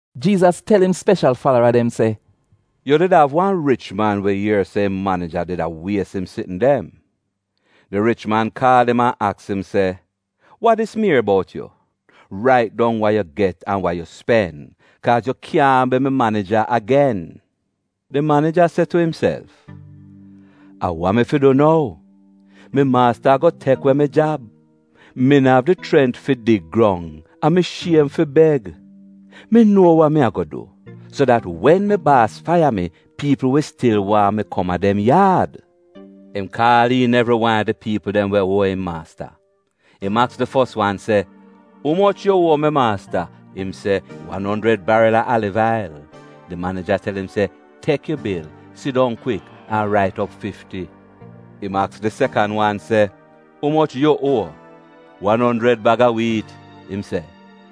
Jiizas tel im speshal falara dem se: “Yu did av wan rich man we ier se im manija did a wies im sitn dem. Di rich man kaal im an aks im se, ‘Wa dis mi ier bout yu? Rait dong wa yu get an wa yu spen, kaaz yu kyaahn bi mi manija agen.’ “Di manija se tu imself, ‘A wa mi fi du nou? Mi maasta ago tek we mi jab. Mi no av di chrent fi dig grong, an mi shiem fi beg. Mi nuo wa mi ago du, so dat wen mi baas faiya mi, piipl wi stil waahn mi kom a dem yaad.’ “Im kaal iin evri wan a di piipl dem we uo im maasta. Im aks di fos wan se, ‘Umoch yu uo mi maasta?’ “Im se, ‘Wan onjrid baril a aliv ail.’ “Di manija tel im se, ‘Tek yu bil, sidong kwik, an rait op fifti.’ “Im aks di sekan wan se, ‘Umoch yu uo?’ “ ‘Wan onjrid bag a wiit,’ im se.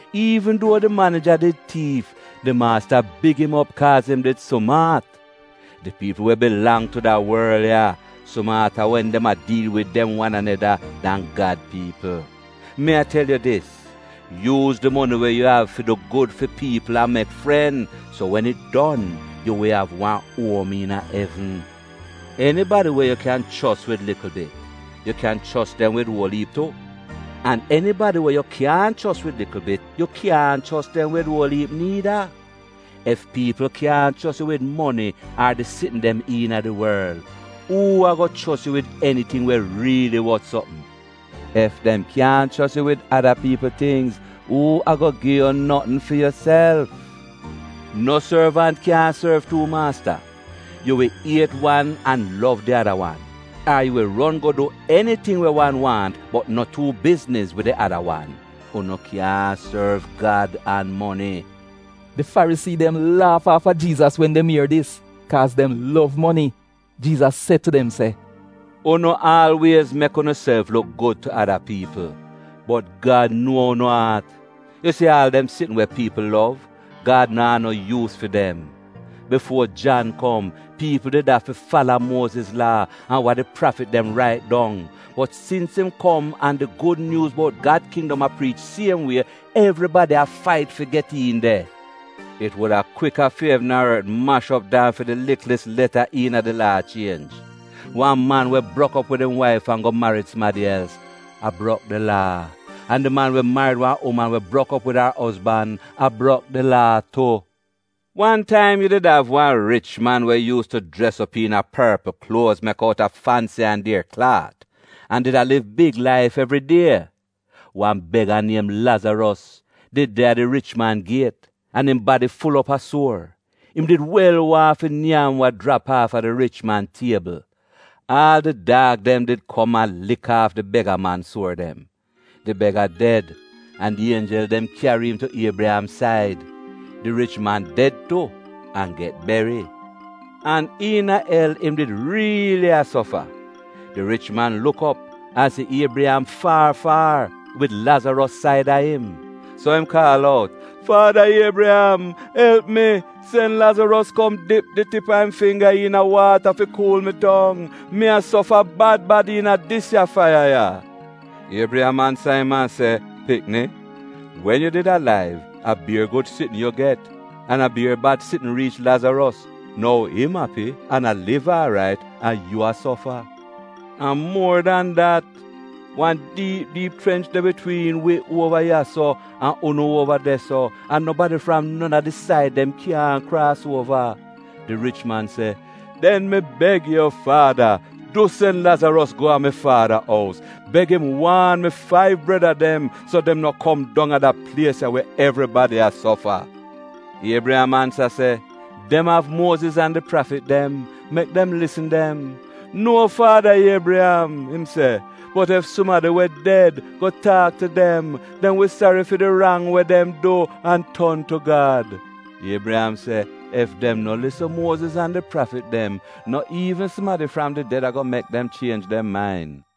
“Iivn duo di manija did tiif, di maasta big im op kaaz im did sumaat. Di piipl we bilang tu da worl ya, sumaata wen dem a diil wid dem wan aneda, dan Gad piipl. Mi a tel yu dis, yuuz di moni we yu av fi du gud fi piipl an mek fren, so wen it don, yu wi av wan uom iina evn. “Enibadi we yu kyan chos wid likl bit, yu kyan chos dem wid uol iip tu, an enibadi we yu kyaahn chos wid likl bit yu kyaahn chos dem wid uol iip niida. Ef piipl kyaahn chos yu wid moni ar di sitn dem iina di worl, uu ago chos yu wid eniting we riili wot sopm? Ef dem kyaahn chos yu wid ada piipl tingz, uu ago gi yu notn fi yuself? “No sorvant kyaahn sorv tuu maasta. Yu wi iet wan an lov di ada wan, ar yu wi ron go du eniting we wan waahn bot no tuu bizniz wid di ada wan. Unu kyaahn sorv Gad an moni.” Di Farisii dem laaf aafa Jiizas wen dem ier dis, kaaz dem lov moni. Jiizas se tu dem se, “Unu aalwiez mek unuself luk gud tu ada piipl, bot Gad nuo unu aat. Yu si aal dem sitn we piipl lov, Gad naa no yuus fi dem. “Bifuo Jan kom piipl did afi fala Muoziz Laa an wa di prafit dem rait dong. Bot sins im kom an di gud nyuuz bout Gad kindom a priich siem wie, evribadi a fait fi get iin de. It wuda kwika fi evn an ort mash op dan fi di liklis leta iina di Laa chienj. “Wan man we brok op wid im waif an go marid sumadi els, a brok di Laa, an di man we marid wan uman we brok op wid ar ozban a brok di Laa tu. “Wan taim yu did av wan rich man we yuus tu jres op iina porpl kluoz mek outa fansi an dier klaat an did a liv big laif evri die. Wan bega, niem Lazaros, did de a di rich man giet, im badi ful op a suor. Im did wel waahn fi nyam wa jrap aafa di rich man tiebl. Aal di daag dem did kom a lik aaf di bega-man suor dem. “Di bega ded an di ienjel dem kyari im tu Iebriyam said. Di rich man ded tu an get beri. An iina el, im did riili a sofa, di rich man luk op an si Iebriyam faar faar, wid Lazaros saida im. So im kaal out, ‘Faada Iebriyam, elp mi, sen Lazaros kom dip di tip a im fingga iina waata fi kuul mi tong. Mi a sofa bad bad iina dis ya faiya ya.’ “Iebriyam ansa im se, ‘Pikni, wen yu did alaiv, a bier gud sitn yu get, an a bier bad sitn riich Lazaros, nou im api an a liv aarait an yu a sofa. An muor dan dat, wan diip diip chrench de bitwiin wi uova ya-so an unu uova de-so, an nobadi fram non a di said dem kyaahn kraas uova.’ “Di rich man se, ‘Den mi beg yu faada, du, sen Lazaros go a mi faada ous, beg im waan mi faiv breda dem, so dem no kom dong a da plies ya, we evribadi a sofa.’ “Iebriyam ansa se, ‘Dem av Muoziz an di prafit dem. Mek dem lisn dem.’ “ ‘Nuo, faada Iebriyam,’ im se, ‘bot ef sumadi we ded go taak tu dem, dem wi sari fi di rang we dem du an ton tu Gad.’ “Iebriyam se, ‘Ef dem no lisn Muoziz an di prafit dem, no iivn sumadi fram di ded ago mek dem chienj dem main.’”